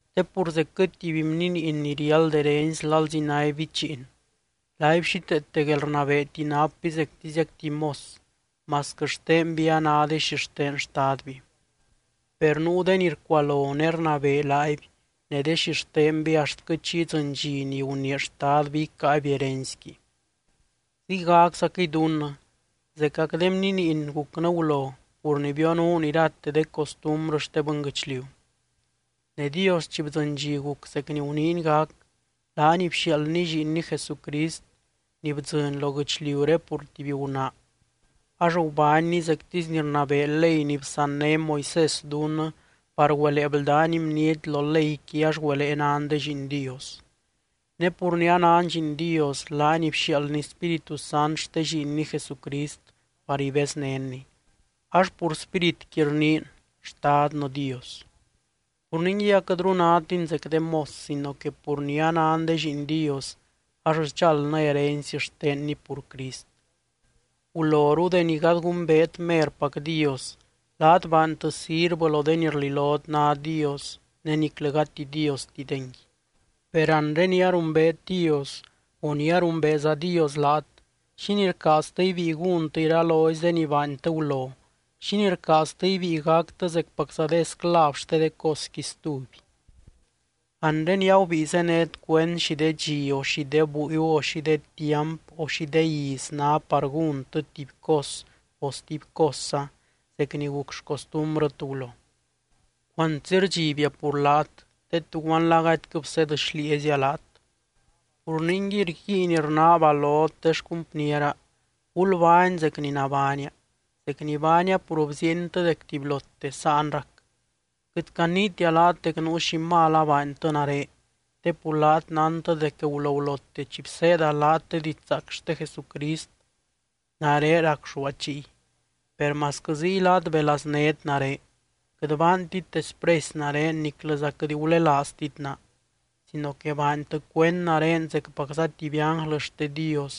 Te pur zecquɨ tuby bniniin ni riáld herency lalzi náby bichiin, laaby xíteete guelrnabeeti napby zectiziac tuby mos, masquɨ xtenby a ná de xixten xtadby. Per nuu de ni rcualo ne rnabee laaby ne de xixtenby axtquɨ chi idzɨny dxi ni gunii xtadby icáaby herencyqui. Ziygaczaquɨy dunnɨ, zecac de bniiniy gucnɨ gulo pur ni bionuun irate de costumbrɨ xte bɨnguɨchliu. Ne Dios chi bdzɨny dxi guc zec ni guniiny gac, laany bxiaaldny Lliinny Jesucrist ni bdzɨny lo guɨchliuré pur tuby gunaa. Ax gubánny zectisy ni rnabee ley ni bsanné Moisés dunnɨ par güelee bldány bniety lo leyqui ax güelee nan de lliin Dios. Ne pur ni anan lliin Dios, laany bxiaaldny Spíritu Sant xte Lliinny Jesucrist par ibeznénny, ax pur Spíritqui rniin: “¡Xtadnɨ Dios!” Pur ningui aquɨtru nátin zec de mos sino que pur ni anan de lliin Dios, ax sdxaldnɨ herency xtenny pur Crist. Guloru deni gady gumbeet merpac Dios, laat baantɨ sirvɨ lo de ni rlilot ná Dios ne niclɨ gati Diostidengui. Per anre ni arumbeet Dios o ni arumbeeza Dios laat, ¿xínii rcaaztɨ ibíi gúntɨ iralozy de ni baantɨ gulo? ¿Xínii rcaaztɨ ibíi gactɨ zecpacza de esclav xte de cosqui stuby? Anre ni agubíi zénet cuend xi de dxi o xi de búiu o xi de tiamp o xi de iz ná par gúntɨ tuby cos o stuby cosza zec ni guc xcostumbrɨt gulo. Cuantsi rdxibia pur laat te, ¡tuguanla gadyquɨ bseed xlieezia laat! Pur ningui rguiin rnaaba lot de xcumpniera: gulbány zec ni nabánia, zec ni baania pur bziientɨ dec tubylote sáan rac. Quɨt caniitia laat dec nuu xi mal abaantɨ nare te pur laat nántɨ dec gulogulote chi bseeda laat de didxzaac xte Jesucrist, nare racxúa chiy. Per masquɨ ziy laat belaznét nare. Quɨt baantit despresy nare niclɨza quɨt gulelaaztit naa, sino que baantɨ cuend nare zecpacza tuby ánglɨ xte Dios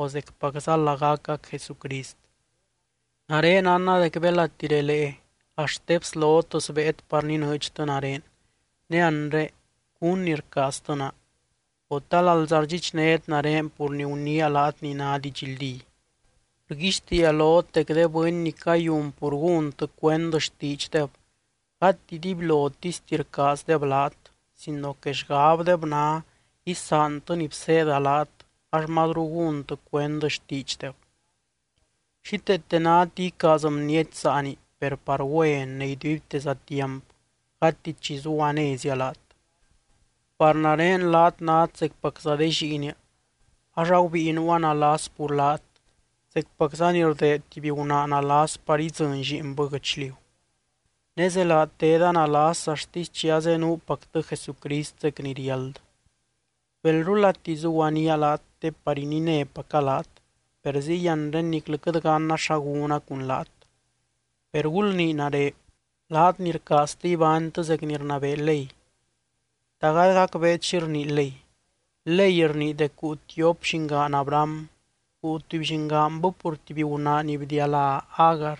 o zecpacza lagacac Jesucrist. Nare nánna dec belati relee axt de bslot sbéet par ninɨɨdxtɨ nare. Ne anre, ¿cún ni rcaaztɨ naa? O, ¿ta lalza rdxichnét nare pur ni guniia laat ni ná didxldí? Rguixtiia lot dec de bɨny ni cayun pur gúntɨ cuend xtiidxdeb, gati dibylotisti rcaazdeb laat sino que xgabdeb ná: isaantɨ ni bseeda laat ax mazru gúntɨ cuend xtiidxdeb. Xíteete náti icaaz bniety saani per par güen ne iduibteza tiamp, gati chi zuguanézia laat. Par nare laat nát zecpacza de lliinia. Ax agubíi nuua nalas pur laat, zecpacza ni rdeed tuby gunaa nalas par idzɨny lliinbɨ guɨchliu. Ne zelaa teda nalas axtisy chi azenuupactɨ Jesucrist zec ni riáld. ¡Belrulati zuguaníaa laat te par ininépaca laat, per ziy anre niclɨ quɨt ganna xa gúna cun laat! Per gulnii nare, laat ni rcaaztɨ ibánytɨ zec ni rnabee ley: ¿Ta gady gacbeet xi rnii ley? Ley rnii dec guu tiop llingaan Abraham. Guu tuby llingaanbɨ pur tuby gunaa ni bdialá Agar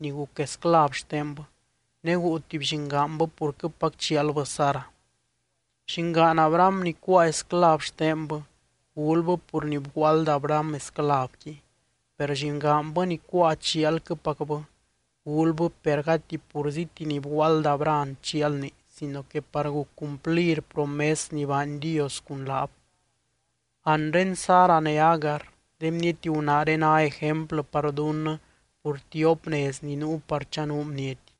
ni guc esclav xtenbɨ, ne guu tuby llingaanbɨ purquɨpac chialbɨ Sara. Llingaan Abraham ni cuáa esclav xtenbɨ, gulbɨ pur ni bguaald Abraham esclavqui. Per llingaanbɨ ni cuáa chialquɨpacbɨ, gulbɨ per agati purzíti ni bguaald Abraham chialni sino que par guc cumplir promes ni baany Dios cun laab. Anre Sara ne Agar, de bniety gunaaré ná ejemplɨ par dunnɨ pur tiop nez ni nuu par chanuu bniety.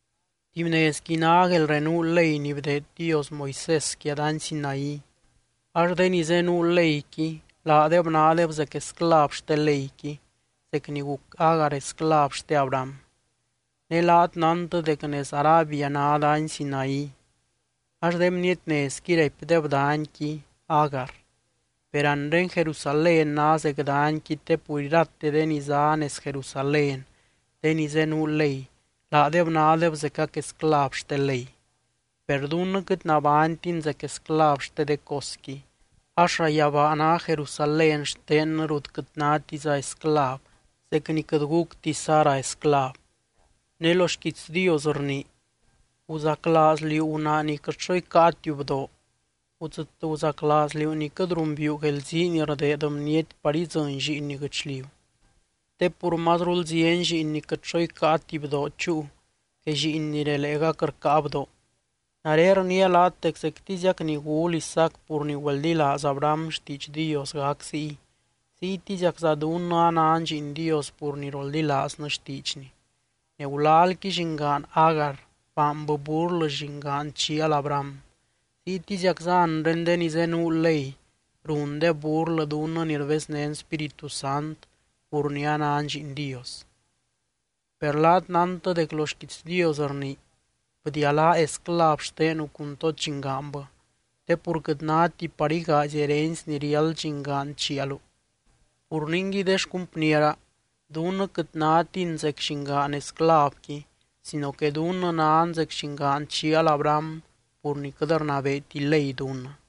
Tuby nezqui ná guelrenuu ley ni bdeed Dios Moisés quia dany Sinaí, ax de ni zenuu leyqui laadeb nádeb zec esclav xte leyqui zec ni guc Agar esclav xte Abraham. Ne laat nántɨ dec nez Arabia ná dany Sinaí ax de bniety nezqui raipdeb danyqui, Agar. Per anre Jerusalén ná zec danyqui te pur irate de ni zá nez Jerusalén, de ni zenuu ley, laadeb nádeb zecac esclav xte ley. Per dunnɨ quɨt nabánytin zec esclav xte de cosqui, ax llayabaa ná Jerusalén xtennɨ rut quɨt nátiza esclav, zec ni quɨt gucti Sara esclav. Ne lo xquiits Dios rnii: Guzaclaaz liú gunaa ni quɨt xo icáatiu bdoo. Gudzɨt guzaclaaz liú ni quɨt rumbiiu guelzii ni rdeed bniety par idzɨny lliinni guɨchliu. Te pur mazrul zieny lliin ni quɨt xo icáati bdoo chúu, que lliin ni releegac rcáa bdoo. Nare rniia laat dec zectiziac ni gul Isaac pur ni güeldilaaz Abraham xtiidx Dios gac ziy, ziytiziacza dunnɨ anan lliin Dios pur ni roldilaaznɨ xtiidxny. Ne gulalqui llingaan Agar, baanbɨ burlɨ llingaan chial Abraham. Ziytiziacza anre de ni zenuu ley rundeb burlɨ dunnɨ ni rbeznén Spíritu Sant, pur ni anan lliin Dios. Per laat nántɨ dec lo xquiits Dios rnii: “Bdialáa esclav xtenu cun tod llingaanbɨ, te pur quɨt náti par igaazy herency ni riáld llingaan chialu.” Pur ningui de xcumpniera, dunnɨ quɨt nátin zec llingaan esclavqui sino que dunnɨ nan zec llingaan chial Abraham pur ni quɨt rnabeeti ley dunnɨ.